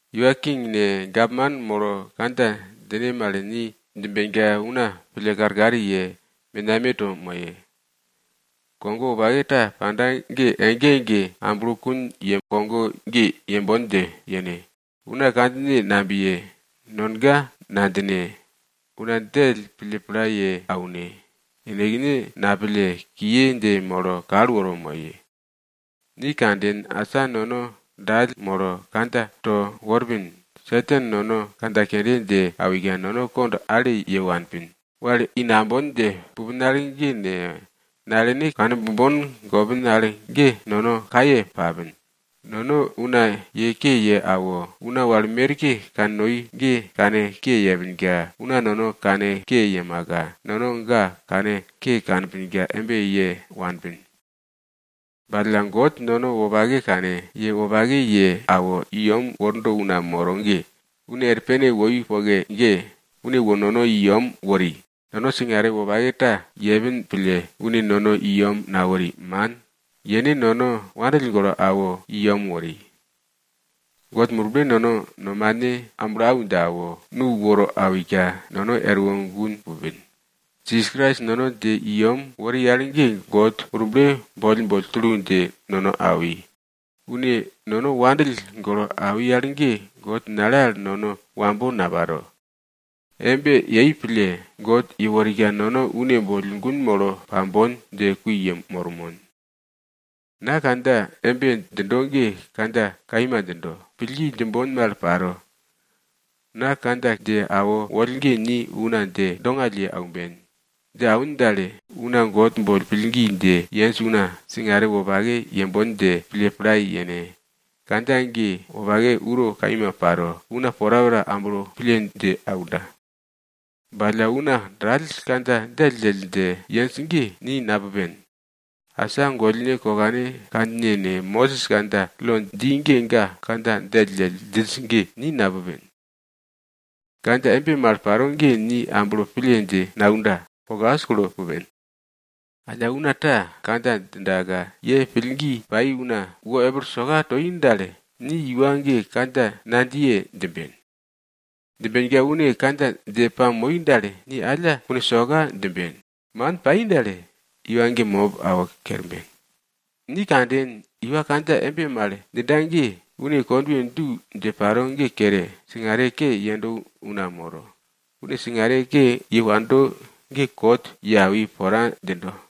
Iwa king ne, gapman molo kandja djine mal ni djimbenka una pille karkar ye, menameto moye. Kogo wopake ta panda ge ege ege amblokun ye kogo ge yembon dje yene. Una kandjine nabiye, nonga nadjine, una djell pille pla ye aune, yenekne napille, kiye dje molo kal woro moye. Ni kanden, asa nono dall molo, kandja to worpin. Satan nono kandja kende dje awika, nono kond ale ye wanpin, wal i nambon dje pupin al ge ne, nalene kane bombon gopin al ge nono kaye papin, nono una ye ke ye awo una wal merke kannoi ge kanke yepinka una nono kanke yemaka, nono ga kanke kanpinka embe ye wanpin. Ba alla God, nono wopake kane, ye wopake ye awo, i yem worda una moro ge, une er pene woi poke ge, une wo nono i yem wori. Nono singare wopake ta yepin pille, une nono i yem nawori, man. Yene nono wandill golo awo i yem wori. God Murble nono nomane amblo au dje awo, nu woro awika, nono erwo gun pupin. Jisas Krais nono dje i yem wori al ge God Murble boll boll tulu dje nono awi. Une nono wopake pille awi al ge, God nale al nono wambo naparo. Embe yei pille, God yeworika nono une boll gun molo pambon dje kui yemormon. Na kandja embe djindo ge kandja kaima djindo, pillgi djimbon mal paro. Na kandja dje awo woll ge ni una dje dongall ye aumben. Dje awin dal, una God boll pillgi dje yenj una, singare wopake yembon dje pille pla yene. Kandja ge wopake uro kaima paro una porapora amblo pille dje aunda. Ba alla una dall kandja djelldjell dje yenj ge, ni napupen. Asa gollne kokane kandjine ne, Mosis kandja lo dji ge ga kandja djelldjell djinj ge, ni napupen. Kandja embe mal paro ge ni amblo pille dje naunda, kokas kulo pupen. Alla una ta kandja djindaka ye pillgi pai una wo epil soka toi dal, ni iwa ge kandja nadjiye djimben. Djimbenka une kandja dje pamoi dal, ni alla kune soka djimben. Man pai dal, iwa ge mop awo kerben. Ni kanden, iwa kandja embe mal djinda ge, une kondwe du dje paro ge kere, singare ke yendo una moro. Une singare ke ye wando ge kot ye awi pora djindo.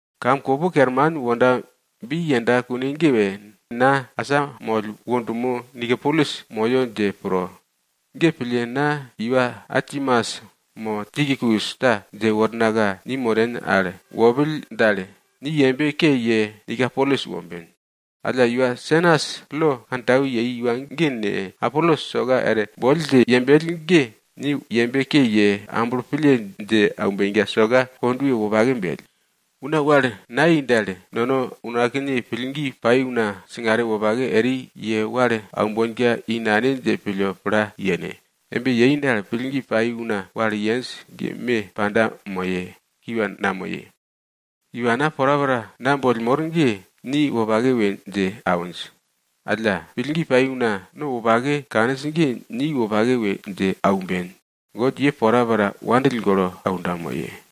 Kam kopo kerman wonda bi yenda kune ge, na asamoll wo dumo Nikopolis moyo dje pro. Ge pille na iwa Artemas mo Tikikus ta dje wornaka, ni moren al wopill dal, ni yembe ke ye Nikopolis womben. Alla Senas, lo kantau yei iwa ge ne, Apolos soka er boll dje yembell ge, ni yembe ke ye, amblo pille dje aumbenka soka kondwe wopake bell. Una wal nayei dal, nono unakne pillgi pai una singare wopake eri ye wal aumbonka i nane dje pille pla yene. Embe yei dal, pillgi pai una wal yenj ge me panda moye, kiwa namoye. Iwana porapora na boll mor ge, ni wopake we dje awinj. Alla, pillgi pai una no wopake kaninj ge ni wopake we dje aumben. God ye porapora wopake pille aunda moye.